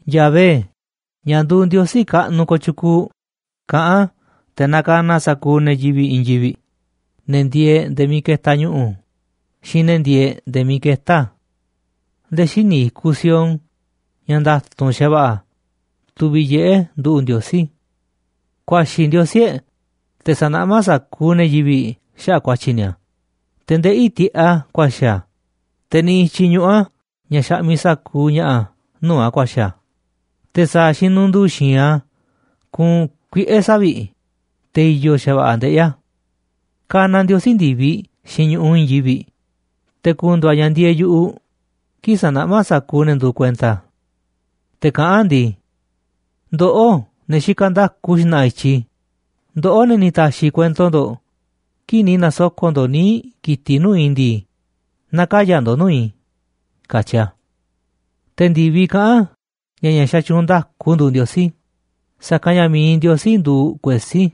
Yahvé, ña̱ nduuꞌ Ndiosí kaꞌnuꞌ kooꞌ tyukuuꞌ, kaꞌán a̱ te̱ nakanaꞌ a̱ sa̱kuuꞌ ne̱ yivi̱ꞌ i̱i̱n yivi̱ꞌ, ne̱ ndieeꞌ nde̱e̱ miiꞌ ketaꞌ ñu̱ꞌu̱ xiinꞌ ne̱ ndieeꞌ nde̱e̱ miiꞌ ketá a̱. Nde̱e̱ xíniꞌ i̱kuꞌ Sión, ña̱ nda̱tu̱nꞌ xa̱va̱ꞌa̱, tuviꞌ yiꞌé nduꞌu̱ꞌ Ndiosí. Ku̱a̱xi̱ Ndiosí e̱ꞌ, te̱ sa̱naꞌmá sa̱kuuꞌ ne̱ yivi̱ꞌ xaꞌa̱ꞌ ku̱a̱tyi̱ ni̱a̱, te̱ ndeꞌí tiꞌeꞌ a̱ ku̱a̱xi̱ a̱, te̱ niꞌiꞌ i̱tyiꞌ ñuꞌu̱ a̱ ña̱ xaꞌmiꞌ sa̱kuuꞌ ña̱ꞌa̱ nuu̱ꞌ a̱ ku̱a̱xi̱ a̱, te̱ sa̱a̱ xinundu̱u̱ xi̱i̱nꞌ a̱ kuunꞌ kuiꞌe̱ savi̱ꞌ, te̱ i̱yo̱ xa̱va̱ꞌa̱ ndeꞌí a̱. Kanaꞌ Ndiosí ndi̱viꞌ xiinꞌ ñu̱ꞌuꞌ i̱i̱n yivi̱ꞌ, te̱ ku̱ndu̱u̱ a̱ ña̱ ndieeꞌ yu̱ꞌuꞌ kii̱ꞌ sa̱naꞌmá a̱ sa̱kuuꞌ ne̱ nduuꞌ kuenta a̱. Te̱ kaꞌán a̱ ndii: “Ndoꞌó, ne̱ xikaꞌ nda̱ku xna̱ꞌa̱ i̱tyiꞌ i̱, ndoꞌó, ne̱ ni̱ ta̱xi̱ kuento ndo̱ꞌ kii̱ꞌ ni̱ na̱soko̱ꞌ ndo̱ꞌ níiꞌ ki̱tiꞌ nuu̱ꞌ i̱ ndii, na̱kaya̱ ndo̱ꞌ nuu̱ꞌ i̱”, katyi a̱. Te̱ ndi̱viꞌ kaꞌán ña̱ ña̱ xatyuunꞌ nda̱ku nduuꞌ Ndiosí, sa̱kanꞌ ña̱ mi̱iꞌ Ndiosí nduuꞌ kuesí.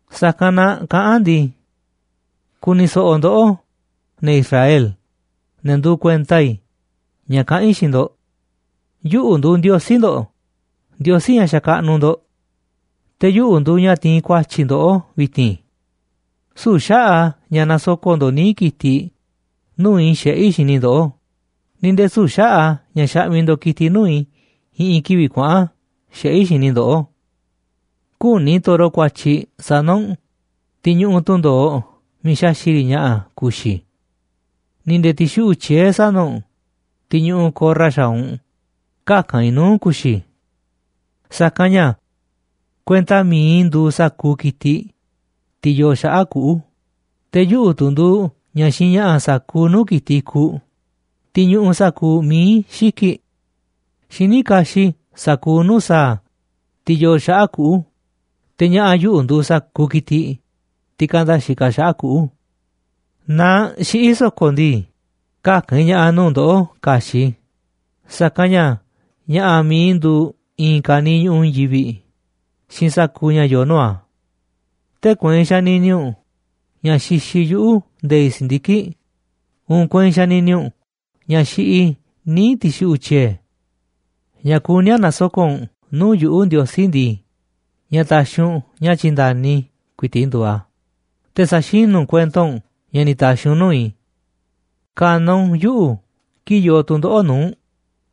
Sa̱kanꞌ na kaꞌán a̱ ndii: “Ku̱ni̱ so̱ꞌo̱ ndoꞌó, ne̱ Israel, ne̱ nduuꞌ kuenta i̱, ña̱ kaꞌán i̱ xiinꞌ ndo̱ꞌ. Yuꞌu̱ nduuꞌ Ndiosí ndo̱ꞌ, Ndiosí ña̱ xakaꞌnuꞌ ndo̱ꞌ. Te̱ yuꞌu̱ nduuꞌ ña̱ tiinꞌ ku̱a̱tyi̱ ndoꞌó vi̱ti̱n. Süu̱ꞌ xaꞌa̱ꞌ a̱ ña̱ nasoko̱ꞌ ndo̱ꞌ níiꞌ ki̱tiꞌ nuu̱ꞌ i̱ xiꞌé i̱ xini ndoꞌó, ni̱ nde̱e̱ süu̱ꞌ xaꞌa̱ꞌ ña̱ xaꞌmiꞌ ndo̱ꞌ ki̱tiꞌ nuu̱ꞌ i̱ i̱ꞌi̱n kivi̱ꞌ kuaꞌa̱n xiꞌé i̱ xini i̱ ndoꞌó. Küní i̱ toro kuatyiꞌ sana̱ u̱nꞌ, tiꞌ ñuꞌuꞌ tundo̱oꞌ miiꞌ xaxi̱ꞌ riꞌ ña̱ꞌa̱ ku̱xi̱ i̱, ni̱ nde̱e̱ ti̱xuꞌu̱ꞌ tyiee̱ sana̱ u̱nꞌ, tiꞌ ñuꞌuꞌ ko̱rra xaaꞌ u̱nꞌ käka̱n i̱ nuu̱ꞌ ku̱xi̱ i̱. Sa̱kanꞌ ña̱ kuenta mi̱iꞌ i̱ nduuꞌ sa̱kuuꞌ ki̱tiꞌ, tiꞌ yoo xaꞌa̱ꞌ kuꞌu̱, te̱ yuꞌu̱ tu̱ nduuꞌ ña̱ xiinꞌ ña̱ꞌa̱ sa̱kuuꞌ nuu̱ꞌ ki̱tiꞌ i̱kuꞌ, tiꞌ ñuꞌuꞌ sa̱kuuꞌ mií xiki̱ꞌ. Xiní kaxiꞌ i̱ sa̱kuuꞌ nuu̱ꞌ sa̱a̱, tiꞌ yoo xaꞌa̱ꞌ kuꞌu̱, te̱ ña̱ꞌa̱ yuꞌu̱ nduuꞌ sa̱kuuꞌ ki̱tiꞌ, tiꞌ kanda xikaꞌ xaꞌa̱ꞌ kuꞌu̱. Naaꞌ xiꞌí i̱ so̱ko̱ ndii, käka̱n i̱ ña̱ꞌa̱ nuu̱ꞌ ndoꞌó ka̱xi̱ꞌ i̱, sa̱kanꞌ ña̱ ña̱ꞌa̱ mi̱iꞌ i̱ nduuꞌ i̱i̱n ka̱niiꞌ ñu̱ꞌuꞌ i̱i̱n yivi̱ꞌ xiinꞌ sa̱kuuꞌ ña̱ yoo nuu̱ꞌ a̱. Tee̱ꞌ kueinꞌ xanini u̱nꞌ ña̱ xixiꞌ yuꞌu̱ nde̱i̱ꞌ si̱ndiki̱ꞌ, uun kueinꞌ xanini u̱nꞌ ña̱ xiꞌiꞌ i̱ níiꞌ ti̱xuꞌu̱ꞌ tyiee̱. Ña̱ kuní a̱ na̱soko̱ꞌ u̱nꞌ nuu̱ꞌ yuꞌu̱, Ndiosí ndii, ña̱ taxiꞌ u̱nꞌ ña̱ tyi̱nda̱ni i̱ ku̱i̱ti̱ꞌ nduuꞌ a̱, te̱ sa̱xinú u̱nꞌ kuento u̱nꞌ ña̱ ni̱ ta̱xi̱ u̱nꞌ nuu̱ꞌ i̱. Ka̱na̱ u̱nꞌ yuꞌu̱ kii̱ꞌ yoo tu̱ndoꞌo̱ꞌ nuu̱ꞌ u̱nꞌ,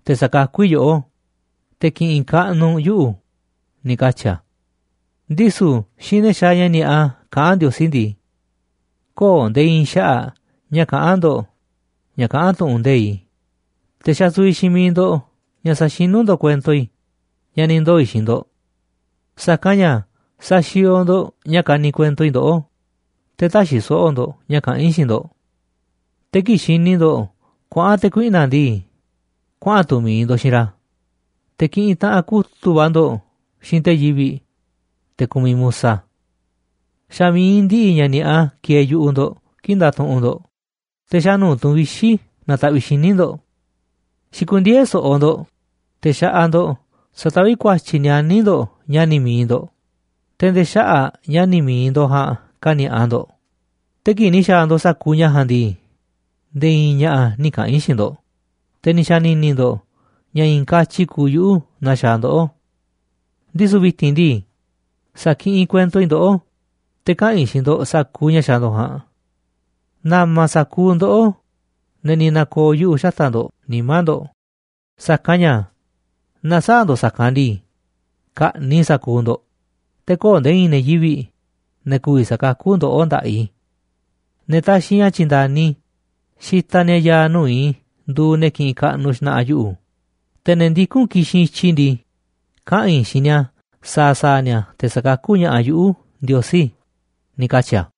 te̱ sa̱kakú i̱ yoꞌó, te̱ ki̱ꞌi̱n kaꞌnuꞌ u̱nꞌ yuꞌu̱”, ni̱ katyi̱ a̱. Ndisu̱ xiinꞌ ne̱ xaaꞌ ña̱ ni̱a̱ꞌa kaꞌán Ndiosí ndii: “Köo̱ꞌ nde̱e̱ i̱i̱n xaꞌa̱ꞌ ña̱ kaꞌán ndo̱ꞌ ña̱ kaꞌán tu̱ꞌu̱n nde̱iꞌ i̱, te̱ xasuviꞌ xiinꞌ miiꞌ ndo̱ꞌ ña̱ saxinú ndo̱ꞌ kuento i̱ ña̱ ni̱ ndoo̱ i̱ xiinꞌ ndo̱ꞌ. Sa̱kanꞌ ña̱ saxiooꞌ ndo̱ꞌ ña̱ kaniꞌ kuento i̱ ndoꞌó, te̱ täxiꞌ so̱ꞌo̱ ndo̱ꞌ ña̱ kaꞌán i̱ xiinꞌ ndo̱ꞌ. Te̱ kii̱ꞌ xini ndo̱ꞌ kuaꞌa̱n te̱ kuiꞌna̱ꞌ ndii, kuaꞌa̱n tu̱ mi̱iꞌ ndo̱ꞌ xiinꞌ ra̱, te̱ kiꞌinꞌ taꞌanꞌ kutu̱ꞌ va̱ ndo̱ꞌ xiinꞌ te̱ yivi̱ꞌ, te̱ kumiꞌ musa. Xa̱ mi̱iꞌ ndiꞌiꞌ ña̱ ni̱a̱ꞌa kieeꞌ yu̱ꞌuꞌ ndo̱ꞌ kii̱ꞌ ndatuꞌunꞌ ndo̱ꞌ, te̱ xa̱ nuu̱ꞌ tu̱n vixi̱ nataꞌviꞌ xíniꞌ ndo̱ꞌ. Xikundieé so̱ꞌo̱ ndo̱ꞌ te̱ xaꞌaꞌ ndo̱ꞌ sataví ku̱a̱tyi̱ nianí ndo̱ꞌ ña̱ni̱ mi̱iꞌ ndo̱ꞌ, te̱ nde̱e̱ xaꞌa̱ꞌ ña̱ni̱ mi̱iꞌ ndo̱ꞌ ja̱a̱nꞌ kani̱a̱ꞌa ndo̱ꞌ. Te̱ kii̱ꞌ ni̱ xa̱a̱ ndo̱ꞌ sa̱kuuꞌ ña̱ ja̱a̱nꞌ ndii, nde̱e̱ i̱i̱n ña̱ꞌa̱ nï̱ kaꞌa̱n i̱ xiinꞌ ndo̱ꞌ, te̱ ni̱ xa̱ni̱ni̱ ndo̱ꞌ ña̱ i̱i̱n katyi kuuꞌ yuꞌu̱ naa xaaꞌ ndoꞌó. Ndisu̱ vi̱ti̱n ndii, sa̱kiꞌinꞌ kuento i̱ ndoꞌó, te̱ kaꞌa̱n i̱ xiinꞌ ndo̱ꞌ sa̱kuuꞌ ña̱ xaaꞌ ndo̱ꞌ ja̱a̱nꞌ. Na̱ma̱ sa̱kuuꞌ ndoꞌó, ne̱ ni̱ na̱ko̱o̱ yuꞌu̱ xataꞌ ndo̱ꞌ nimá ndo̱ꞌ, sa̱kanꞌ ña̱ naaꞌ sä̱a̱ ndo̱ꞌ sa̱kanꞌ ndii, ka̱ꞌni̱ꞌ i̱ sa̱kuuꞌ ndo̱ꞌ, te̱ köo̱ꞌ nde̱e̱ i̱i̱n ne̱ yivi̱ꞌ, ne̱ ku̱vi̱ sa̱kakú ndoꞌó nda̱ꞌaꞌ i̱. Ne̱ taxiꞌ ña̱ tyi̱nda̱ni i̱ xitaꞌ ni̱a̱ ya̱a̱ nuu̱ꞌ i̱ nduuꞌ ne̱ kiꞌinꞌ kaꞌnuꞌ xna̱ꞌa̱ yuꞌu̱, te̱ ne̱ ndikún ki̱xinꞌ i̱tyiꞌ i̱ ndii, kaꞌa̱n i̱ xiinꞌ ni̱a̱ sa̱a̱ sa̱a̱ ni̱a̱ te̱ sa̱kakú ña̱ꞌaꞌ yuꞌu̱, Ndiosí”, ni̱ katyi̱ a̱.